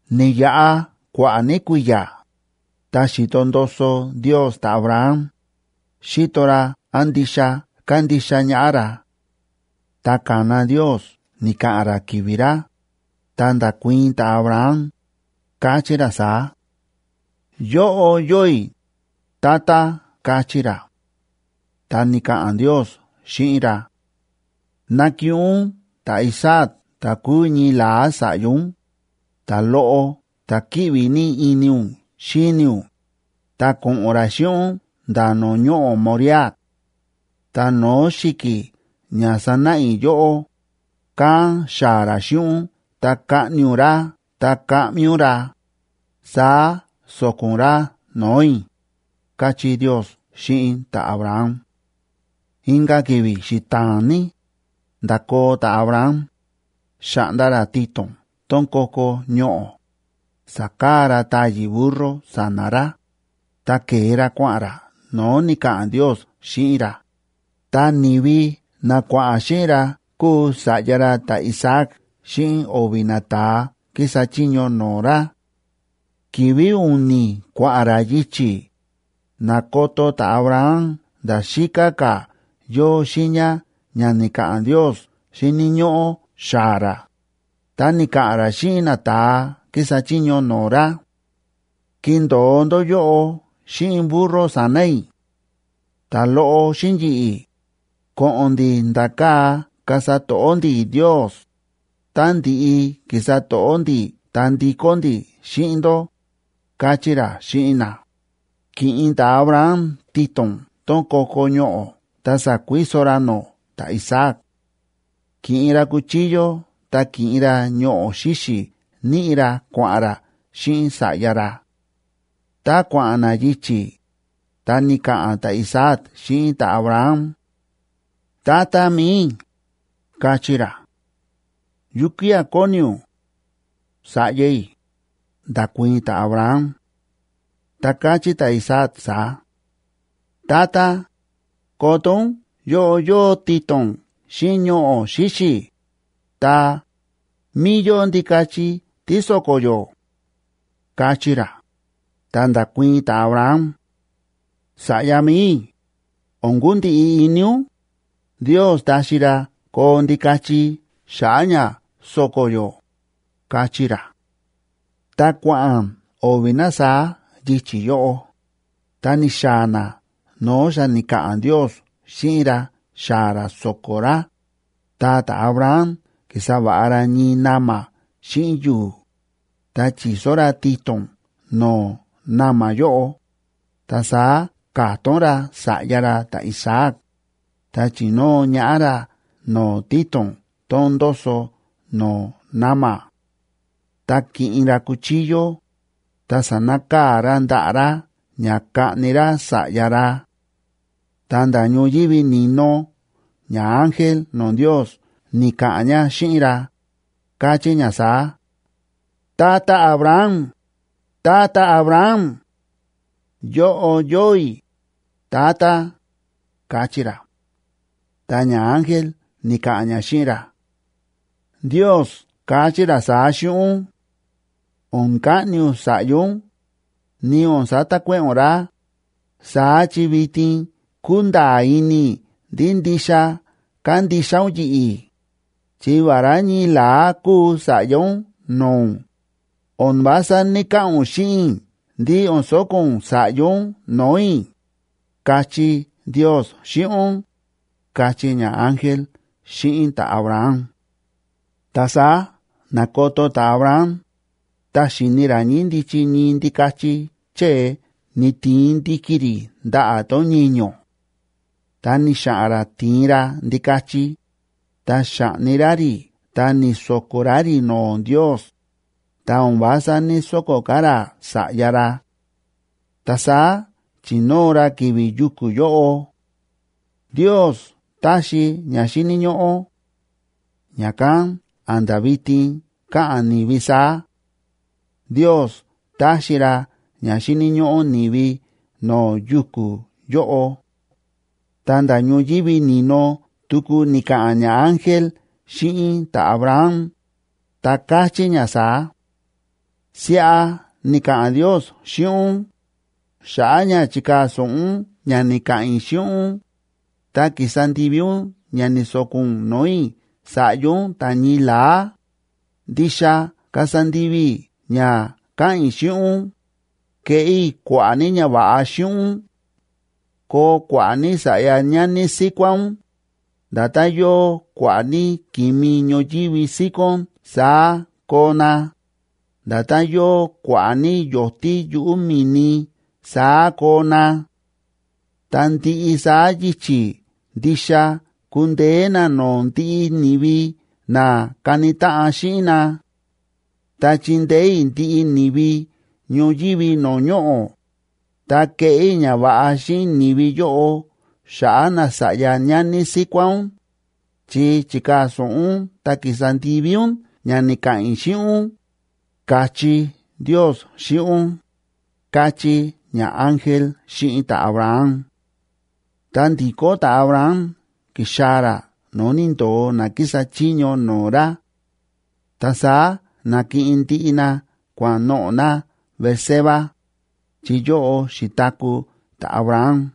Ni̱yaꞌa kua̱ꞌa̱ ní kui̱ya̱, ta xi̱to ndoso Ndios ta̱Abraham, xíto ra án ndixa kándixa ñaꞌá ra. Ta ka̱na Ndios ni̱ka̱ꞌa̱n ra ki̱vi̱ ra, ta nda̱kuii̱n ta̱Abraham, káchí ra saá: ―Yóꞌo yóo i̱, Tata ―káchí ra. Ta ni̱ka̱ꞌa̱n Ndios xíꞌin ra: ―Nakiꞌin ún ta̱Isaac ta̱ kúu ñii la̱á sa̱ꞌya ún, ta̱loꞌo ta̱ kíꞌvi ní ini ún xíni ún, ta ko̱ꞌo̱n ra xíꞌin ún nda̱ no̱o̱ ñoꞌo̱ Moriah. Ta no̱o̱ xi̱ki̱ ña sanáꞌa i̱ yóꞌó, kán xaa̱ ra xíꞌin ún ta kaꞌni ún ra ta kaꞌmi ún ra, saá so̱ko̱ ún ra no̱o̱ i̱ ―káchí Ndios xíꞌin ta̱Abraham. Inka̱ ki̱vi̱ xita̱a̱n ní, nda̱koo ta̱Abraham, xa̱ꞌnda ra tito̱n tón ko̱ko̱ ñoꞌo̱, sa̱kaa ra táyi̱ burro sa̱na̱ ra, ta ke̱e ra kua̱ꞌa̱n ra no̱o̱ ni̱ka̱ꞌa̱n Ndios xíꞌin ra, ta ni̱vi na kua̱ꞌa̱n xíꞌin ra kúu sa̱ꞌya ra ta̱Isaac xíꞌin o̱vi̱ nata̱a kísa chiño no̱o̱ ra. Ki̱vi̱ u̱ni̱ kua̱ꞌa̱n ra yichi̱, na̱koto ta̱Abraham nda̱ xíká ka̱ yóo xiiña ña ni̱ka̱ꞌa̱n Ndios xíni̱ ñóꞌó xaa̱ ra, ta ni̱ka̱ꞌa̱n ra xíꞌin nata̱a kísa chiño no̱o̱ ra: ―Kindo̱o ndó yóꞌo xíꞌin burro sa̱na̱ i̱. Ta̱loꞌo xíꞌin yi̱ꞌi̱, ko̱ꞌo̱n ndi̱ nda̱ kaa̱ kasa to̱ꞌó ndi̱ Ndios, ta ndi̱ꞌi ki̱sa to̱ꞌó ndi̱ ta ndikó ndi̱ xíꞌin ndó ―káchí ra xíꞌin na. Ki̱ꞌin ta̱Abraham tito̱n tón ko̱ko̱ ñoꞌo̱ ta sa̱kuiso ra nó ta̱Isaac; ki̱ꞌin ra cuchillo ta ki̱ꞌin ra ñoꞌo̱ xíxi̱ níꞌi ra kua̱ꞌa̱n ra xíꞌin sa̱ꞌya ra. Tá kua̱ꞌa̱n na yichi̱, ta ni̱ka̱ꞌa̱n ta̱Isaac xíꞌin ta̱Abraham: ―Tata mi̱i i̱ ―káchí ra. ―¿Yukía̱ kóni ún?, sa̱ꞌya i̱ ―nda̱kuii̱n ta̱Abraham. Ta káchí ta̱Isaac saá: ―Tata, koto ún yóꞌo yóo tito̱n xíꞌin ñoꞌo̱ xíxi̱, ta, ¿mí yóo ndikachi tí so̱ko̱ yó? ―káchí ra. Ta nda̱kuii̱n ta̱Abraham: ―Sa̱ꞌya mi̱i i̱, o̱n kundiꞌi ini ún, Ndios taxi ra koo ndikachi xa̱ꞌa̱ ña so̱ko̱ yó ―káchí ra. Ta kua̱ꞌa̱n o̱vi̱ na saá yichi̱ yóꞌo. Ta ni̱xaa̱ na no̱o̱ xa ni̱ka̱ꞌa̱n Ndios xíꞌin ra xaa̱ ra so̱ko̱ ra, ta ta̱Abraham ki̱sa va̱ꞌa ra ñii na̱ma̱ xíꞌin yu̱u̱, ta chi̱so ra tito̱n no̱o̱ na̱ma̱ yóꞌo, ta saá ka̱tón ra sa̱ꞌya ra ta̱Isaac, ta chi̱nóo ñaꞌá ra no̱o̱ tito̱n tón ndóso no̱o̱ na̱ma̱. Ta ki̱ꞌin ra cuchillo, ta sa̱nakaa̱ ra ndaꞌa̱ ra ña kaꞌni ra sa̱ꞌya ra. Ta nda̱ ñoyívi ni̱no ñaángel no̱o̱ Ndiosa ni̱ka̱ꞌa̱n ña xíꞌin ra, káchí ña saá: ―¡Tata Abraham! ¡Tata Abraham! ―Yóꞌo yóo i̱, Tata ―káchí ra. Ta ñaángel ni̱ka̱ꞌa̱n ña xíꞌin ra: ―Ndios káchí ra saá xíꞌin ún: “O̱n kaꞌni ún sa̱ꞌya ún, ni o̱n satakuéꞌe̱ ún ra, saá chi vitin kúnda̱a̱ ini i̱ ndí ndixa kándixa ún yi̱ꞌi̱, chi vará ñii la̱á kúu sa̱ꞌya ún no̱o̱ ún, o̱n vása ní‑kaꞌa̱n ún xíꞌin i̱ ndí o̱n so̱ko̱ ún sa̱ꞌya ún no̱o̱ i̱”, káchí Ndios xíꞌin ún ―káchí ñaángel xíꞌin ta̱Abraham. Ta saá na̱koto ta̱Abraham, ta xi̱ni ra ñíndichi ñii ndikachi chée ni̱tiin ndi̱ki̱ rí ndaꞌa̱ tón ñiño̱. Ta ni̱xa̱ꞌa̱n ra ti̱in ra ndikachi, ta xa̱ꞌni ra rí ta ni̱so̱ko̱ ra rí no̱o̱ Ndios, ta o̱n vása ní‑soko̱ ka̱ ra sa̱ꞌya ra. Ta saá chi̱nóo ra ki̱vi̱ yuku̱ yóꞌo Ndios táxi ña xíni̱ ñóꞌó. Ña̱kán a̱nda̱ vitin káꞌa̱n ni̱vi saá: “Ndios táxi ra ña xíni̱ ñóꞌó ni̱vi no̱o̱ yuku̱ yóꞌo.” Ta nda̱ ñoyívi ni̱no tuku ni̱ka̱ꞌa̱n ñaángel xíꞌin ta̱Abraham, ta káchí ña saá: Siꞌa ni̱ka̱ꞌa̱n Ndios xíꞌin ún: “Xa̱ꞌa̱ ña chi̱kaa̱ so̱ꞌo ún ña ni̱ka̱ꞌa̱n i̱ xíꞌin ún, ta ki̱sa ndivi ún ña ni̱so̱ko̱ ún no̱o̱ i̱ sa̱ꞌya ún ta̱ ñii la̱á, ndixa kasa ndivi i̱ ña káꞌa̱n i̱ xíꞌin ún, keꞌé i̱ kua̱ꞌa̱ ní ñava̱ꞌa xíꞌin ún. Koo kua̱ꞌa̱ ní sa̱ꞌya ñani síkuá ún, nda̱tán yóo kua̱ꞌa̱ ní ki̱mi ñoyívi síkón saá koo na, nda̱tán yóo kua̱ꞌa̱ ní yo̱tí yuꞌu̱ mi̱ni saá koo na. Ta ndiꞌi saá yichi̱ ndixa kundeé na no̱o̱ ndiꞌi ni̱vi na kani táꞌan xíꞌin na. Ta chindeé i̱ ndiꞌi ni̱vi ñoyívi no̱o̱ ñoꞌo̱, ta keꞌé i̱ ñava̱ꞌa xíꞌin ni̱vi yóꞌo xa̱ꞌa̱ nasa̱ꞌya ñani síkuá ún, chi chi̱kaa̱ so̱ꞌo ún ta ki̱sa ndivi ún ña ni̱ka̱ꞌa̱n i̱ xíꞌin ún”, ka̱chí Ndios xíꞌin ún, káchí ñaángel xíꞌin ta̱Abraham. Ta ndi̱kó ta̱Abraham ki̱xaa̱ ra no̱o̱ ni̱ndo̱o na kísa chiño no̱o̱ ra. Ta saá na̱kiꞌin ndiꞌi na kua̱ꞌa̱n noꞌo̱ na Beerseba, chi yóꞌo xi̱taku̱ ta̱Abraham.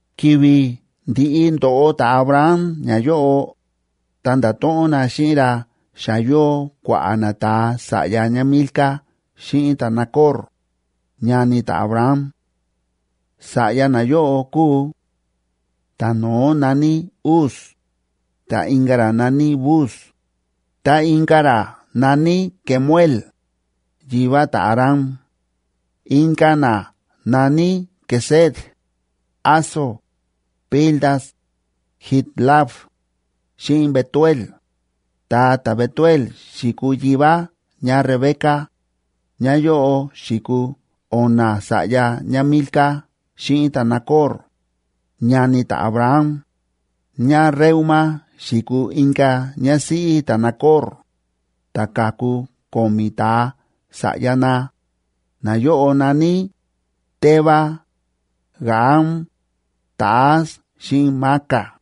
Ki̱vi̱ ndi̱ꞌi ndo̱ꞌo ta̱Abraham ñayóꞌo, ta nda̱to̱ꞌon na xíꞌin ra xa yóo kua̱ꞌa̱ nata̱a sa̱ꞌya ñáMilca xíꞌin ta̱Nacor, ñani ta̱Abraham. Sa̱ꞌya nayóꞌo kúu: ta̱no̱ó na̱ní Uz, ta inka̱ ra na̱ní Buz, ta inka̱ ra na̱ní Kemuel, yivá ta̱Aram. Inka̱ na na̱ní Quesed, Hazo, Pildas, Jidlaf, xíꞌin Betuel. Ta ta̱Betuel xi̱kuu yivá ñáRebeca. Nayóꞌo xi̱kuu o̱na̱ sa̱ꞌya ñáMilca xíꞌin ta̱Nacor, ñani ta̱Abraham. ÑáReúma xi̱kuu inka̱ ñásíꞌí ta̱Nacor, ta ka̱ku ko̱mi̱ ta̱a sa̱ꞌya na; nayóꞌo na̱ní: Teba, Gaham, Tahas xíꞌin Maaca.